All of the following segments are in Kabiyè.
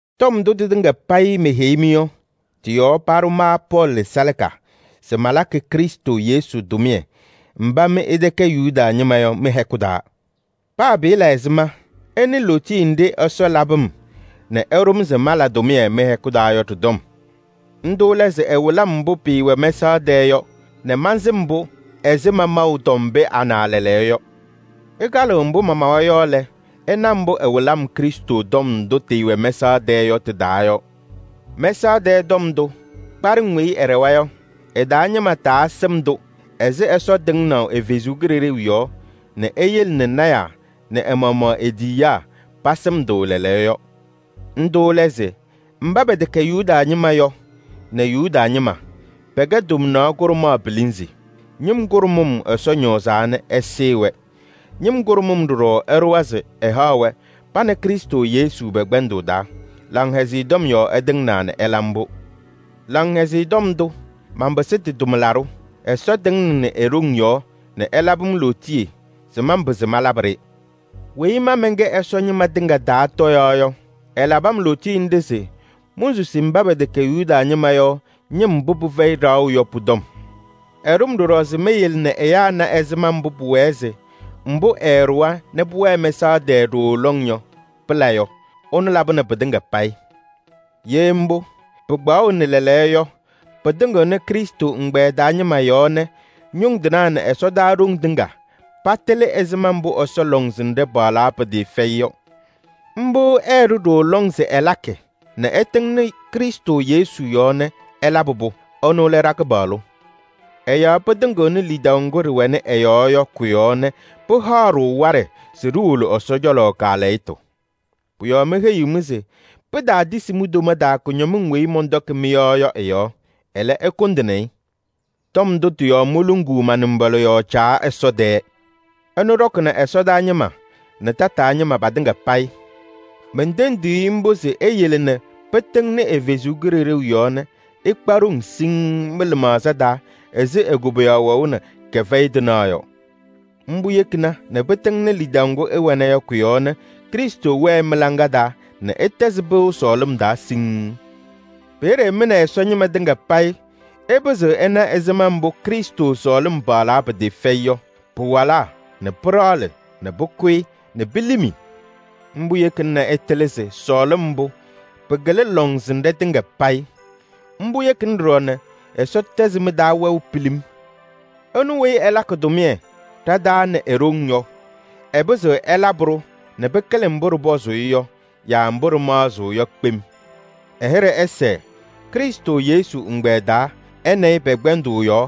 Tɔm ndʋ tɩtɩŋa payɩ meheyi-mɩ yɔ, tɩ-yɔɔ paɖʋ ma Pɔɔlɩ salaka se malakɩ Krɩstʋ Yesu tʋmɩyɛ mba mɩ ɩtɛkɛ Yuda ñɩma yɔ mɩ-hɛkʋ taa. Paa pɩɩla ɛzɩma, ɩnɩ lootiye nɖɩ Ɛsɔ labɩ-m nɛ ɛɖʋ-m se mala tʋmɩyɛ mɩ-hɛkʋ taa yɔ ɖɩ-tɔm. Ndʋ lɛ se ɛwɩlɩ-m mbʋ pɩɩwɛ mɛsaɣ tɛɛ yɔ nɛ mansɩm-pʋ ɛzɩ mamaʋ tɔm pee ana lɛɛlɛɛyɔ yɔ. Ɩkalɩɣ mbʋ mamawa yɔ lɛ, ɩna mbʋ ɛwɩlɩ-m Krɩstʋ tɔm ndʋ tɩɩwɛ mɛsaɣ tɛɛ yɔ tɩ-taa yɔ. Mɛsaɣ tɛɛ tɔm ndʋ, kpaɖɩŋ weyi ɩɖɛwa yɔ, ɩ-taa ñɩma taasɩm-tʋ ɛzɩ Ɛsɔ tɩŋnaʋ ɛ-Kalɩzaɣ yɔɔ nɛ eyele nɛ lɔɔyɩsɩ tɩnaa nɛ ɛ-maɣmaɣ e-tiyiyaa pasɩm-tʋ lɛɛlɛɛyɔ yɔ. Ndʋ lɛ se: mba pɛtɛkɛ Yuda ñɩma yɔ nɛ Yuda ñɩma, pɛkɛ tomnaɣ kʋɖʋmaɣ pilinzi. Ñɩm kʋɖʋmʋm Ɛsɔ ñɔɔzaa nɛ ɛsɩɩ-wɛ. Ñɩm kʋɖʋmʋm ɖɔɖɔ ɛɖʋwa se ɛhaɣ-wɛ pa nɛ Krɩstʋ Yesu pɛ-kpɛndʋʋ taa. Laŋhɛzɩyɛ Tɔm yɔɔ ɛtɩŋnaa nɛ ɛla mbʋ. Laŋhɛzɩyɛ Tɔm ndʋ, manpɩsɩ tɩ-tʋmlaɖʋ. Ɛsɔ tɩŋnɩnɩ e-ɖoŋ yɔɔ nɛ ɛlabɩ-m lootiye se manpɩzɩ malabɩ-ɖɩ. Weyi ma mɛnkɛ Ɛsɔ ñɩma tɩŋa taa tɔyaɣ yɔ, ɛlabɩ-m lootiye nɖɩ se monsusi mba pɛtɛkɛ Yuda ñɩma yɔ ñɩm mbʋ pɩfɛyɩ ɖaɣʋ yɔ pʋ-tɔm. Ɛɖʋ-m ɖɔɖɔ se meyele nɛ ɛyaa na ɛzɩma mbʋ pʋwɛɛ se mbʋ ɛɛɖʋwa nɛ pʋwɛɛ mɛsaɣ tɛɛ ɖooo lɔŋ yɔ, pɩla yɔ. Ɛnʋ labɩnɩ pɩtɩŋa payɩ. Ye mbʋ, pɩkpaɣʋnɩ lɛɛlɛɛyɔ yɔ, pɩtɩŋɩɣnɩ Krɩstʋ ɛgbɛyɛ taa ñɩma yɔɔ nɛ ñʋŋ tɩnaa nɛ ɛsɔdaa ɖoŋ tɩŋa patɩlɩ ɛzɩma mbʋ Ɛsɔ lɔŋsɩnɖɛ paɣlaa pɩtɩɩfɛyɩ yɔ. Mbʋ ɛɛɖʋ ɖooo lɔŋ se ɛlakɩ nɛ ɛtɩŋnɩ Krɩstʋ Yesu yɔɔ nɛ ɛlabɩ-pʋ. Ɛnʋ lɛ ɖa-Kɩpaɣlʋ. Ɛ-yɔɔ pɩtɩŋɩɣnɩ lidaʋ ŋgʋ ɖɩwɛnɩ ɛ-yɔɔ yɔ kʋ-yɔɔ nɛ pɩhaɣ-ɖʋ waɖɛ se ɖiwolo Ɛsɔ cɔlɔ kaalɛyɩtʋ. Pʋ-yɔɔ meheyiɣ-mɩ se pitaatisi mi-toma taa kʋñɔmɩŋ weyi mɔntɔkɩ mɩ-yɔɔ yɔ ɩ-yɔɔ. Ɛlɛ, ɩkʋndɩnɩ-ɩ. Tɔm ndʋ tɩ-yɔɔ moluŋuu ma-nɩmbɔla yɔɔ Caa Ɛsɔ tɛɛ. Ɛnʋ ɖɔkɩnɩ ɛsɔdaa ñɩma nɛ tataa ñɩma patɩŋa payɩ. Mentendiɣ-i mbʋ se eyele nɛ pɩtɩŋnɩ ɛ-Kalɩzaɣ yɔɔ nɛ ɩkpa ɖoŋ siŋŋ mɩ-lɩmaɣza taa ɛzɩ e-koboyaɣ wɛʋ nɛ kɛfɛyɩ tɩnaɣ yɔ. Mbʋ yekina nɛ pɩtɩŋnɩ lidaʋ ŋgʋ ɩwɛna yɔ kʋ-yɔɔ nɛ Krɩstʋ wɛɛ mɩ-laŋa taa nɛ ɩtɛzɩ pɩʋ sɔɔlɩm taa siŋŋ. Peeye mɩ nɛ Ɛsɔ ñɩma tɩŋa payɩ ɩpɩzɩɣ ɩna ɛzɩma mbʋ Krɩstʋ sɔɔlɩm paɣlaa pɩtɩɩfɛyɩ yɔ: pɩwalaa nɛ pɩɖaɣlɩ nɛ pʋkʋyɩ nɛ pilimi. Mbʋ yekina nɛ ɩtɩlɩ se sɔɔlɩm mbʋ pɩkɩlɩ lɔŋsɩnɖɛ tɩŋa payɩ. Mbʋ yekina ɖɔɖɔ nɛ Ɛsɔ tɛzɩ mɩ-taa wɛʋ pilim. Ɛnʋ weyi ɛlakɩ tʋmɩyɛ ɖa-taa nɛ e-ɖoŋ yɔ, ɛpɩzɩɣ ɛlabɩ-ɖʋ nɛ pɩkɩlɩ mbʋ ɖɩpɔzʋʋ-ɩ yɔ yaa mbʋ ɖɩmaɣzɩɣ yɔ kpem. Ɛ-hɩɖɛ ɛsɛɛ Krɩstʋ Yesu ɛgbɛyɛ taa ɛ nɛ ɩ pɛ-kpɛndʋʋ yɔɔ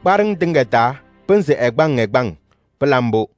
kpaɖɩŋ tɩŋa taa pɩnzɩ ɛgbaŋ ɛgbaŋ! Pɩla mbʋ.